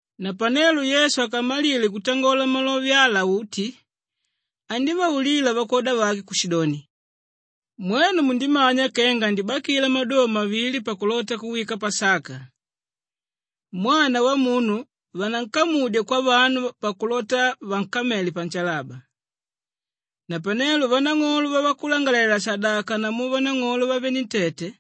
Napanelo Yesu akamalile kutangola malove ala uti, andívaulila vakwoda vake kushidoni, “Mwenu mundimanya kenga andibakila maduva mavili pakulota kuwika Pasaka. Mwana Wamunu vanankamudya kwavanu pakulota vankamele panshalaba.” Napanelo vanang'olo vavakulangalalela-shadaka namu vanang'olo vavenentete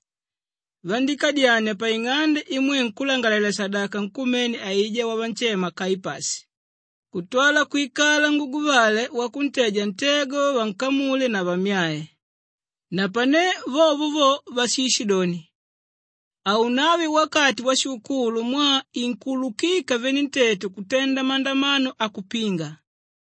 vandíkadyania paing'ande imwe nkúlangalalela-shadaka nkumene aijá wavanshema Kaipashi kutwala kwikala nguguvale wakuteja ntego vankamule na vammyae. Napane vovo vo vashishidoni, “Haunave wakati washikukulu mwaa inkuulukika venentete kutenda mandamano akupinga.”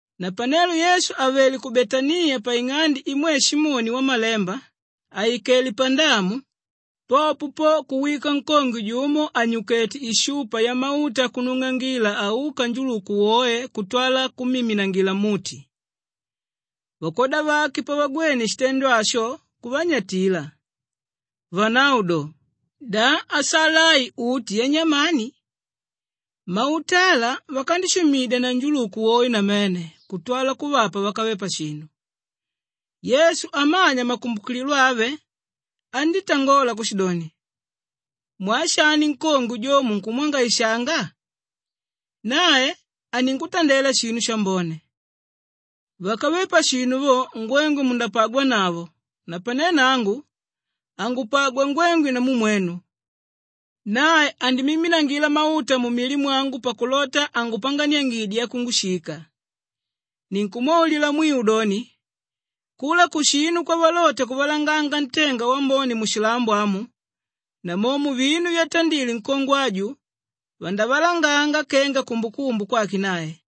Napanelo Yesu àvele ku Betaniya paing'ande imwe Simoni wamalemba àikele pandamu, popo po kuwika nkongwe jumo ànyukete ishupa yamauta akunung'angila auka njuluku woe kutwala kummiminangila mmuti. Vakwoda vake pavagwene shitendo asho kuvanyatila, vanavo do, “Da asala ai uti yanyamani? Mauta ala vakandishumidya na njuluku woe namene kutwala kuvapa vákave pashinu.” Yesu amanya makumbukililo ave andítangola kushidoni, “Mwaa shani nkongwe jo munkumwangaishanga? Nae aningutandela shinu shambone. Vákave pashinu vo, ngwengwe mundapagwanavo napane nangu, hangupagwa ngwengwe namu mwenu. Nae andimiminangila mauta mumili mwangu pakulota angupanganiange yakungushika. Ninkumwaulila mwiu doni, kula kushinu kwavalota kuvalanganga ntenga wambone mushilambo amu, namomo vinu vyatandile nkongwe aju vandavalanganga kenga kumbukumbu kwake nae.”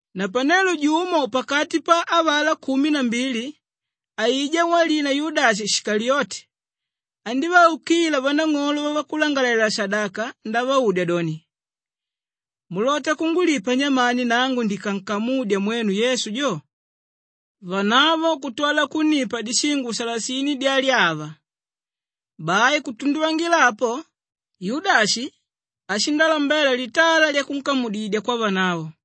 Napanelo jumo pakati pa avalá kumi na mbili, aijá walina Yudashi Shikaliyote, andívaukila vanang'olo vavakulangalalela-shadaka ndavaudya doni, “Mulota kungulipa nyamani nangu ndikankamudya mwenu Yesu jo?” Vanavo kutwala kunnipa dishingo salasini dyalyava. Bai kutunduvangila apo, Yudashi ashindalambela litala lyakunkamudidya kwavanavo.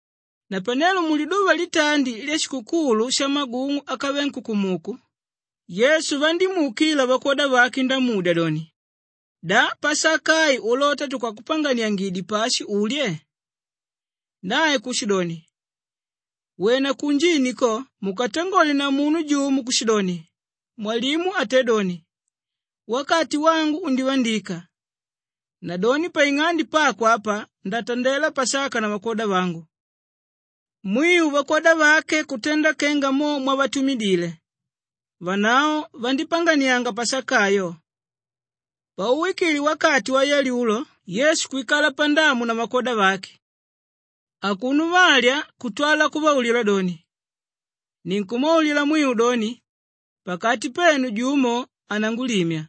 Napanelo muliduva litandi lyashikukulu shamagung'u ákave nkukumuku, Yesu vandímuukila vakwoda vake ndamudya doni, “Da Pasaka ai, ulota tukakupanganiangidye pashi ulye?” Nae kushidoni, “Wena kunjini ko mukatangole na munu jumo kushidoni, ‘Mwalimu atédoni, “Wakati wangu undivandika, nadoni paing'ande pako apa ndatandela Pasaka na vakwoda vangu.”’” Mwiu vakwoda vake kutenda kenga mo mwavatumidile; vanavo vandípanganianga Pasaka ayo. Pauwikile wakati wayalyulo Yesu kwikala pandamu na vakwoda vake. Akuno valya kutwala kuvaulila doni, “Ninkumwaulila mwiu doni, pakati penu jumo anangulimya.”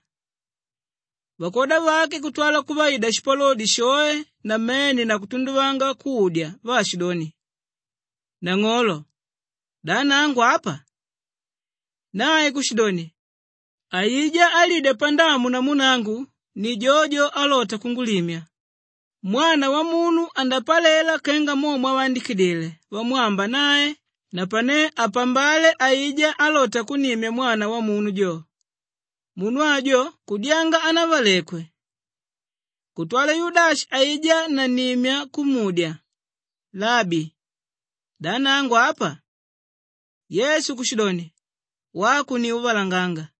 Vakwoda vake kutwala kuvaida shipalodi shoe namene na kutunduvanga kudya vaashidoni, “Nang'olo, da nangu apa?” Nae kushidoni, “Aijá álidya pandamu namu nangu ni jojo álota kungulimya. Mwana Wamunu andapalela kenga mo mwavandikidile vamwamba nae napane apambale aijá álota kunnimya Mwana Wamunu jo! Munu ajo kudyanga hanavalekwe.” Kutwala Yudashi aijá nannimya kumudya, “Labi, da nangu apa?” Yesu kushidoni, “Wako ni úvalanganga.”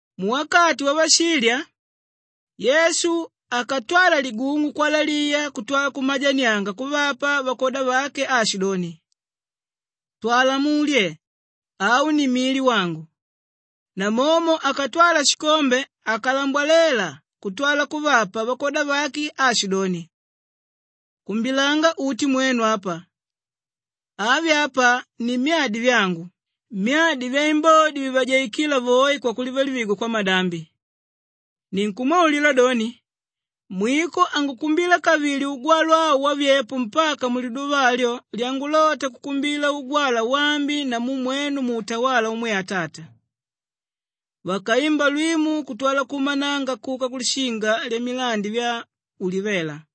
Muwakati wavashilya, Yesu akatwala ligung'u kwalaliya kutwala kumajanianga kuvapa vakwoda vake aashidoni, “Twala mulye! Au ni mili wangu.” Namomo akatwala shikombe akalambwalela kutwala kuvapa vakwoda vake aashidoni, “Kumbilanga uti mwenu apa. Avi apa ni myadi vyangu, myadi vyaimbodi vivajaikíla voe kwakulivalivigwa kwamadambi. Ninkumwaulila doni, mwiko hangukumbila kavili ugwalwa au wavyepo mpaka muliduva alyo lyangulota kukumbila ugwalwa waambi namu mwenu muutawala umwe Atata.” Vakaimba lwimu kutwala kuumananga kuka kulishinga lyamilandi vya Ulivela.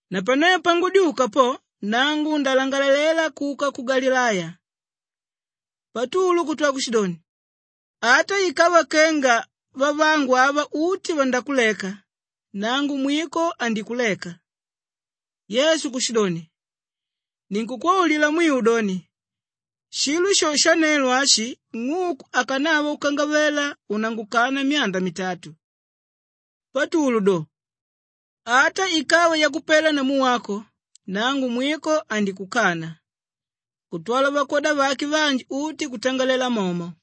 Napane pangudyuka po, nangu ndalangalela kuka ku Galileya.” Patulu kutwala kushidoni, “Ata ikava kenga vavangu ava uti vandakuleka, nangu mwiko handikuleka!” Yesu kushidoni, “Ninkukwaulila mwiu doni, shilo sho shanelo ashi ng'uku akanava kukangavela unangukana myanda mitatu.” Patulu do, “Ata ikava yakupela namu wako, nangu mwiko handikukana.” Kutwala vakwoda vake vanji uti kutangalela momo.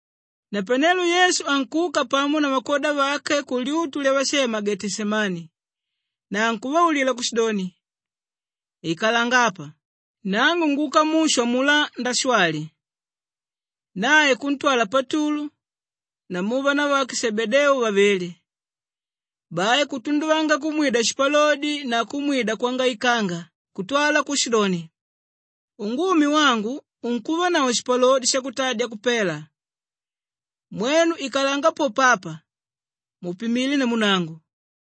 Napanelo Yesu ankuka pamo na vakwoda vake kulyutu lyavashema Geteshemani na ankuvaulila kushidoni, “Ikalanga apa! Nangu nguka mushu amulá ndashwali.” Nae kuntwala Patulu namu vanavake Shebedeu vavili. Bai kutunduvanga kumwida shipalodi na kumwida kwangaikanga kutwala kushidoni, “Ungumi wangu unkuvanavo shipalodi shakutadya kupela. Mwenu ikalanga popo apa, mupimile namu nangu.”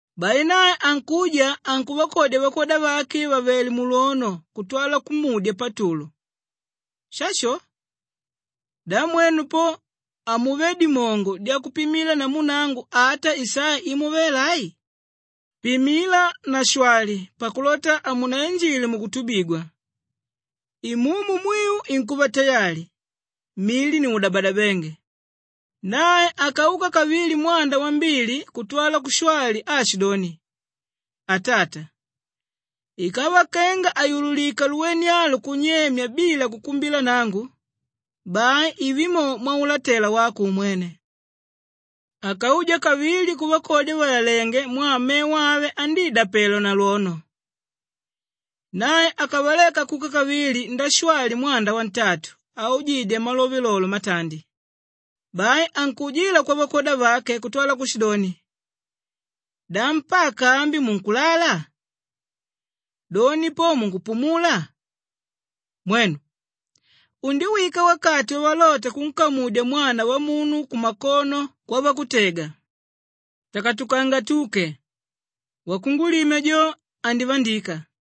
Bai nae ankuja, ankuvakodya vakwoda vake vàvele mulwono kutwala kumudya Patulu, “Shasho! Da mwenu po hamuvé dimongo dyakupimila namu nangu ata isaa imo vela ai? Pimila na shwali pakulota hamunainjile mukutubigwa! Imumu mwiu inkuva tayali, mili ni udabadabénge.” Nae akauka kavili mwanda wambili kutwala kushwali aashidoni, “Atata, ikava kenga hayululika luwene alu kunyema bila kukumbila nangu, bai ive mo mwaulatela wako umwene.” Akauja kavili kuvakodya vàlalenge mwaa mevo ave andidapelwa na lwono. Nae akavaleka kuka kavili ndashwali mwanda wantatu aujidya malove lolo matandi. Bai ankuujila kwavakwoda vake kutwala kushidoni, “Da mpaka ambi munkulala? Doni po munkupumula? Mwenu, undiwika wakati wavalota kunkamudya Mwana Wamunu kumakono kwavakutega. Takatukanga tuke! Wakungulimya jo, andivandika!”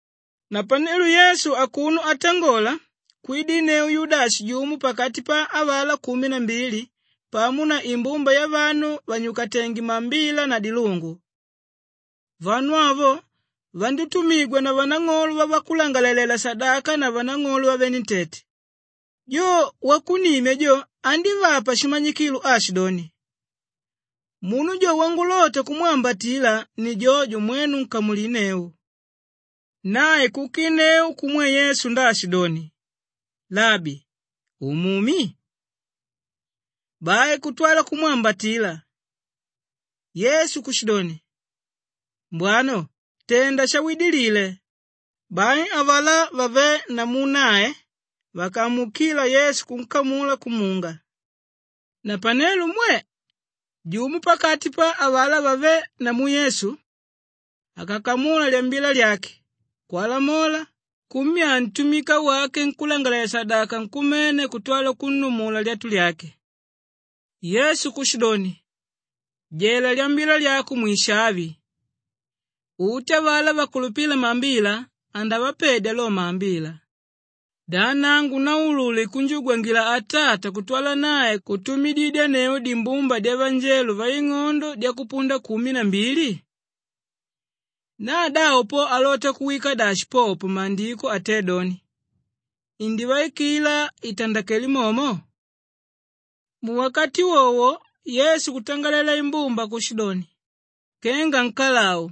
Napanelo Yesu akuno atangola kwidinneu Yudashi jumo pakati pa avalá kumi na mbili pamo na imbumba yavanu vànyukatenge maambila na dilungu. Vanu avo, vandítumigwa na vanang'olo vavakulangalalela-shadaka na vanang'olo vavenentete. Jo wakunnimya jo andívapa shimanyikilo aashidoni, “Munu jo wangulota kumwambatila ni jojo, mwenu nkamulinneu.” Nae kukinneu kumwe Yesu ndaashidoni, “Labi, umumi?” Bai kutwala kumwambatila. Yesu kushidoni, “Mbwana, tenda shawidilile.” Bai avalá vavé namu nae vakamuukila Yesu kunkamula kumunga. Napanelo mwe! Jumo pakati pa avalá vavé namu Yesu akakamula lyambila lyake, kwalamola, kummyaa ntumika wake nkúlangalalela-shadaka nkumene kutwala kunnumula lyatu lyake. Yesu kushidoni, “Jela lyambila lyako mwishavi! Uti avalá vakulupíla maambila andavapedya lo maambila. Da nangu naulule kunjugwangila Atata kutwala nae kutumididyanneu dimbumba dyavanjelo vaing'ondo dyakupunda kumi na mbili? Na davo po alota kuwikila dashi popo Maandiko atédoni, ‘Indivaikila itandakele momo’?” Muwakati wowo Yesu kutangalela imbumba kushidoni, “Kenga nkalau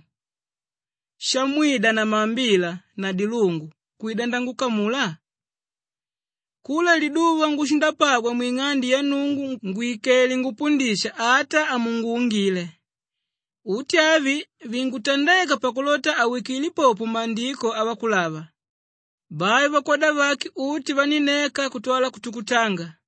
shamwida na maambila na dilungu kwida nangukamula? Kula liduva ngushindapagwa mwing'ande ya Nnungu ngwìkele ngupundisha ata hamunguungile. Uti avi vinkutandeka pakulota awikile popo Maandiko avakulava.” Bai vakwoda vake uti vanínneka kutwala kutukutanga.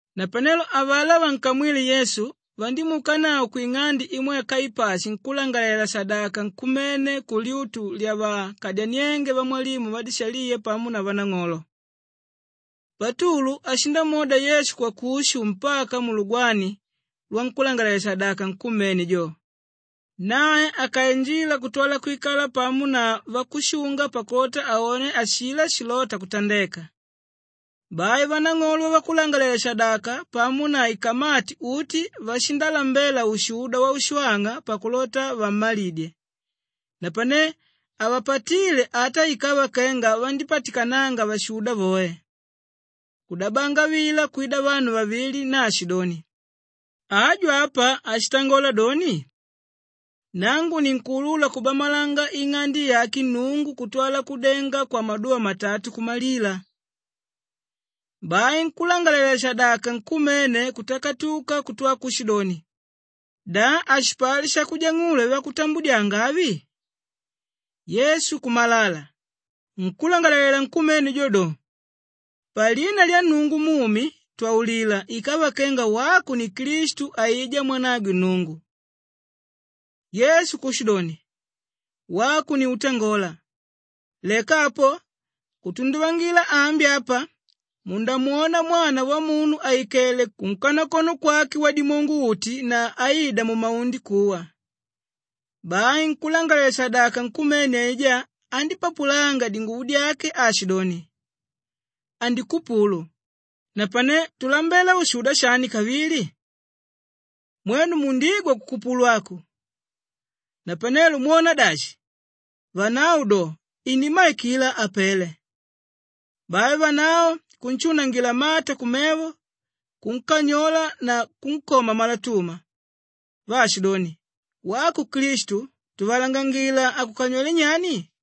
Napanelo avalá vankamwíle Yesu vandímuukanavo kwing'ande imwe Kaipashi nkúlangalalela-shadaka nkumene kulyutu lyavakadyaniénge vamwalimu vadishaliya pamo na vanang'olo. Patulu ashindamwoda Yesu kwakushu mpaka mulugwani lwankúlangalalela-shadaka nkumene jo. Nae akainjila kutwala kwikala pamo na vakushunga pakulota aone ashilá shilóta kutandeka. Bai vanang'olo vavakulangalalela-shadaka pamo na ikamati uti vashindalambela ushuda waushwang'a pakulota vammalidye, napane havapatíle ata ikava kenga vandípatikananga vashuda voe. Kudabanga vila kwida vanu vavili naashidoni, “Aju apa ashitangola doni, ‘Nangu ninkuulula kubamalanga ing'ande yake Nnungu kutwala kudenga kwamaduva matatu kumalila.’” Bai nkúlangalalela-shadaka nkumene kutakatuka kutwa kushidoni, “Da hashipali shakujang'ula vyavakutambudyanga avi?” Yesu kumalala. Nkúlangalalela nkumene jo do, “Palina lya Nnungu mumi, twaulila ikava kenga wako ni Klistu aijá mwanagwe Nnungu!” Yesu kushidoni, “Wako ni útangola. Leka apo kutunduvangila ambi apa mundamwona Mwana Wamunu àikele kunkanakono kwake Wadimongo-uti na aida mumaundi kuwa.” Bai nkúlangalalela-shadaka nkumene aijá andípapulanga dinguvo dyake aashidoni, “Andikupulu! Napane tulambela ushuda shani kavili? Mwenu mundigwa kukupulu aku. Napanelo mwona dashi?” Vanavo do, “Inimmaikila apele.” Bai vanavo kunshunangila mata kumevo, kunkanyola na kunkoma malatuma vaashidoni, “Wako Klistu, tuvalangangila akukanywelé nyani?”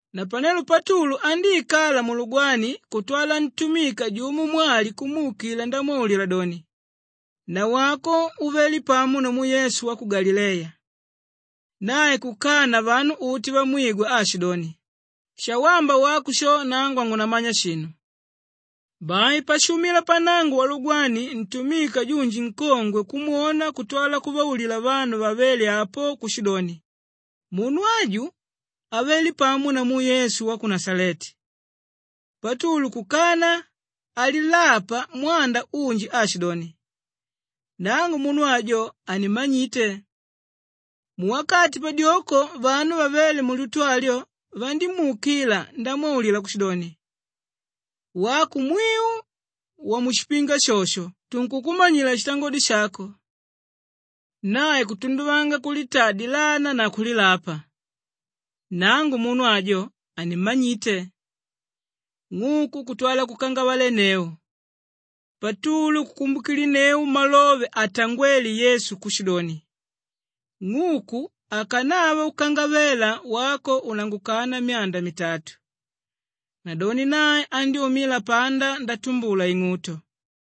Napanelo Patulu andíikala mulugwani kutwala ntumika jumo mwali kumuukila ndamwaulila doni, “Nawako uvele pamo namu Yesu wa ku Galileya.” Nae kukana vanu uti vamwigwa aashidoni, “Shawamba wako sho nangu hangunamanya shinu.” Bai pashuumila pannango walugwani, ntumika junji nkongwe kumwona kutwala kuvaulila vanu vavéle apo kushidoni, “Munu aju avele pamo namu Yesu wa ku Nashaleti.” Patulu kukana alilapa mwanda unji aashidoni, “Nangu munu ajo hanimmanyite.” Muwakati padyoko vanu vavéle mulyutu alyo vandímuukila ndamwaulila kushidoni, “Wako mwiu wamushipinga shosho tunkukumanyila shitangodi shako.” Nae kutunduvanga kulitaa dilana na kulilapa, “Nangu munu ajo hanimmanyite!” Ng'uku kutwala kukangavalenneu. Patulu kukumbukilinneu malove atangwéle Yesu kushidoni, “Ng'uku akanava kukangavela wako unangukana myanda mitatu.” Nadoni nae andyúmila panda ndatumbula ing'uto.